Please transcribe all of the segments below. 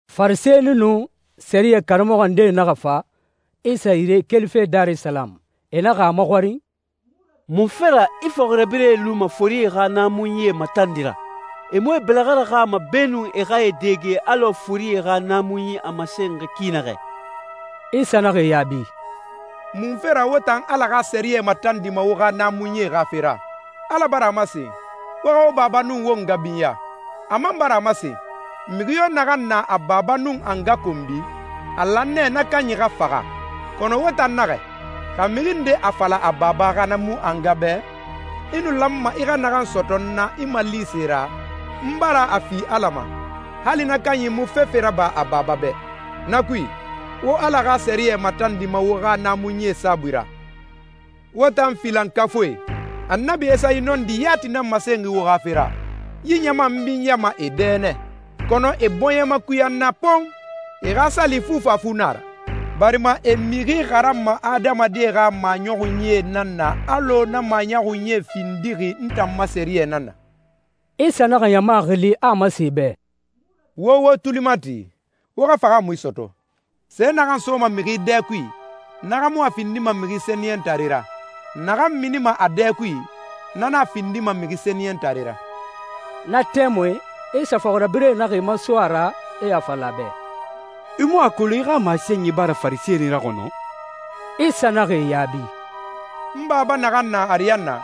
Farisɛni nun sɛriyɛ karamɔxɔ ndee naxa fa Isa yire kelife Darisalamu. E naxa a maxɔrin, «Munfe ra i fɔxirabirɛe luma forie xa naamunyie matandi ra? E mu e bɛlɛxɛ raxama beenun e xa e dɛge alɔ forie xa naamunyie a masenxi ki naxɛ.» Isa naxa e yaabi, «Munfe ra wo tan Ala xa sɛriyɛ matandima wo xa naamunyie xa fe ra? Ala bara a masen, ‹Wo xa wo baba nun wo nga binya.› A man bara a masen, ‹Mixi yo naxan na a baba nun a nga konbi, a lan nɛ na kanyi xa faxa.› Kɔnɔ wo tan naxɛ, xa mixi nde a fala a baba xa na mu a nga bɛ, ‹I nu lanma i xa naxan sɔtɔ n na i malise ra, n bara a fi Ala ma,› hali na kanyi mu fefe raba a baba bɛ. Na kui, wo Ala xa sɛriyɛ matandima wo xa naamunyi saabui ra. Wo tan filankafuie! Annabi Esayi nɔndi yati nan masen wo xa fe ra, ‹Yi ɲama n binyama e dɛ nɛ, kɔnɔ e bɔɲɛ makuya n na pon! E xa sali fufafu nan a ra, barima e mixi xaranma adamadie xa maɲɔxunyie nan na alɔ na maɲɔxunyie findixi n tan ma sɛriyɛ nan na.›» Isa naxa ɲama xili, a a masen e bɛ, «Wo wo tuli mati, wo xa fahaamui sɔtɔ. Se naxan soma mixi dɛ kui, na xa mu a findima mixi sɛniyɛntare ra. Naxan minima a dɛ kui, na nan a findima mixi sɛniyɛntare ra.» Na tɛmui Isa fɔxirabirɛe naxa e maso a ra, e a fala a bɛ, «I mu a kolon i xa masenyi bara Farisɛnie raxɔnɔ?» Isa naxa e yaabi, «N Baba naxan na ariyanna,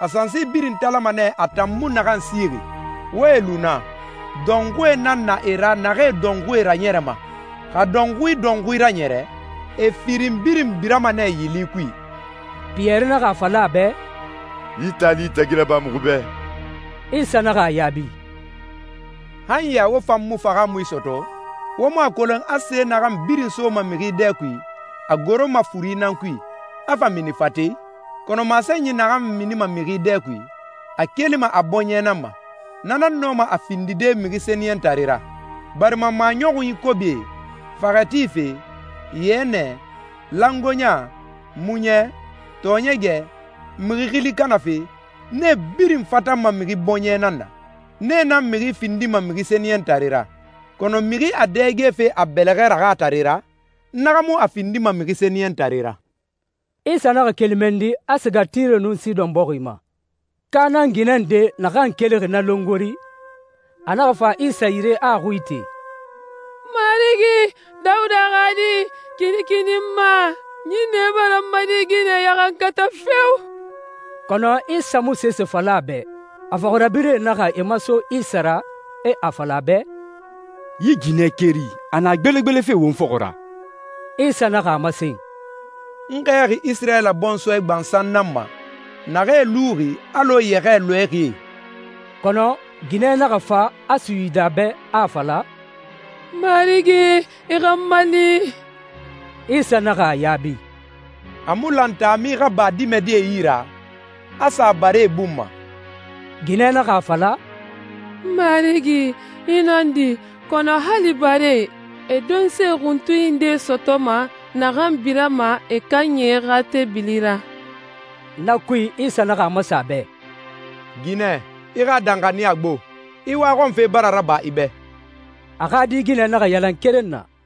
a sansi birin talama nɛ a tan mu naxan sixi. Wo e lu na. Dɔnxui nan na e ra naxee dɔnxuie raɲɛrɛma. Xa dɔnxui dɔnxui raɲɛrɛ, e firin birin birama nɛ yili kui.» Piyɛri naxa a fala a bɛ, «Yi taali tagi raba muxu bɛ.» Isa naxa a yaabi, «Han ya wo fan mu fahaamui sɔtɔ? Wo mu a kolon a se naxan birin soma mixi dɛ kui, a goroma furi nan kui, a fa mini fate i? Kɔnɔ masenyi naxan minima mixi dɛ kui, a kelima a bɔɲɛ nan ma. Na nan nɔma a findide mixi sɛniyɛntare ra. Barima maɲɔxun kobie, faxɛ tife, yɛnɛ, langoeɲa, muɲɛ, tɔɔɲɛgɛ, mixi xili kanafe, nee birin fatanma mixi bɔɲɛ nan na. Nee nan mixi findima mixi sɛniyɛntare ra, kɔnɔ mixi a dɛgefe a bɛlɛxɛ raxatare ra, na xa mu a findima mixi sɛniyɛntare ra.» Isa naxa keli mɛnni, a siga Tire nun Sidɔn bɔxi ma. Kanaan ginɛ nde naxan kelixi na longori, a naxa fa Isa yire a a xui ite, «Marigi, Dawuda xa Di, kinikini n ma. Ɲinnɛ bara n ma di ginɛ ɲaxankata feo!» Kɔnɔ Isa mu sese fala a bɛ. A fɔxirabirɛe naxa e maso Isa ra, e a fala a bɛ, «Yi ginɛ keri, a na gbelegbelefe won fɔxɔ ra.» Isa naxa a masen, «N xɛɛxi Isirayila bɔnsɔɛ gbansan nan ma, naxee luxi alɔ yɛxɛɛ lɔɛxie.» Kɔnɔ ginɛ naxa fa a suyidi a bɛ, a a fala, «Marigi, i xa n mali!» Isa naxa a yaabi, «A mu lan taami xa ba dimɛdie yi ra, a sa baree bun ma.» Ginɛ naxa a fala, «Marigi, i nɔndi, kɔnɔ hali baree, e donse xuntunyi nde sɔtɔma naxan birama e kanyi xa teebili ra.» Na kui, Isa naxa a masen a bɛ, «Ginɛ, i xa danxaniya gbo! I waxɔnfe bara raba i bɛ.» A xa di ginɛ naxa yalan keren na.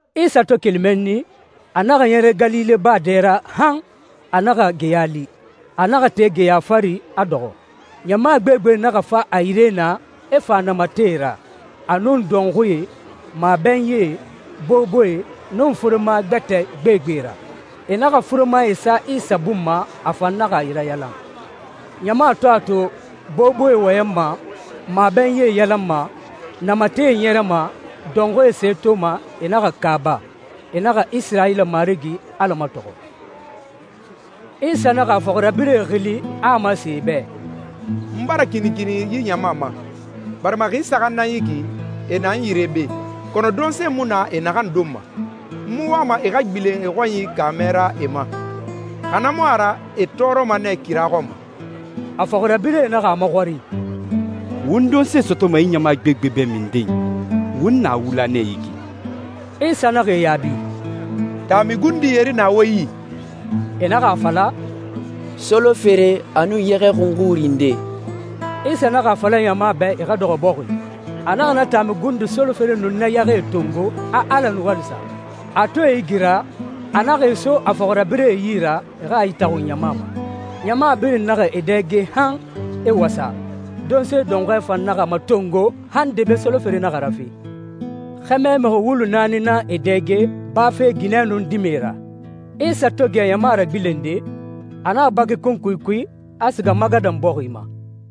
Isa to keli mɛnni, a naxa ɲɛrɛ Galile baa dɛ ra han a naxa geya li. A naxa te geya fari, a dɔxɔ. Ɲama gbegbe naxa fa a yire naa, e fa namatɛe ra, a nun dɔnxuie, mabɛnyie, boboe, nun furema gbɛtɛe gbegbe ra. E naxa furemae sa Isa bun ma, a fan naxa e rayalan. Ɲama to a to boboe wɔyɛnma, mabɛnyie yalanma, namatɛe ɲɛrɛma, dɔnxuie se toma, e naxa kaaba. E naxa Isirayila Marigi Ala matɔxɔ. Isa naxa a fɔxirabirɛe xili, a a masen e bɛ, «N bara kinikini yi ɲama ma, barima xi saxan nan yi ki, e na n yire be, kɔnɔ donse mu na e naxan donma. N mu wama e xa gbilen e xɔnyi kaamɛ ra e ma, xa na mu a ra e tɔɔrɔma nɛ kira xɔn ma.» A fɔxirabirɛe naxa a maxɔrin, «Won donse sɔtɔma yi ɲama gbegbe bɛ minden? Won na wula nɛ yi ki.» Isa naxa e yaabi, «Taami gundi yeri na wo yi?» E naxa a fala, «Solofere, a nun yɛxɛ xunxuri ndee.» Isa naxa a fala ɲama bɛ e xa dɔxɔ bɔxi. A naxa na taami gundi solofere nun na yɛxɛe tongo, a Ala nuwali sa. A to e igira, a naxa e so a fɔxirabirɛe yi ra, e xa e itaxun ɲama ma. Ɲama birin naxa e dɛge han e wasa. Donse dɔnxɔɛ fan naxa matongo han debe solofere naxa rafe. Xɛmɛ mixi wulu naani nan e dɛge, bafe ginɛe nun dimɛe ra. Isa to gɛ ɲama ragbilende, a naxa baki kunkui kui, a siga Magadan bɔxi ma.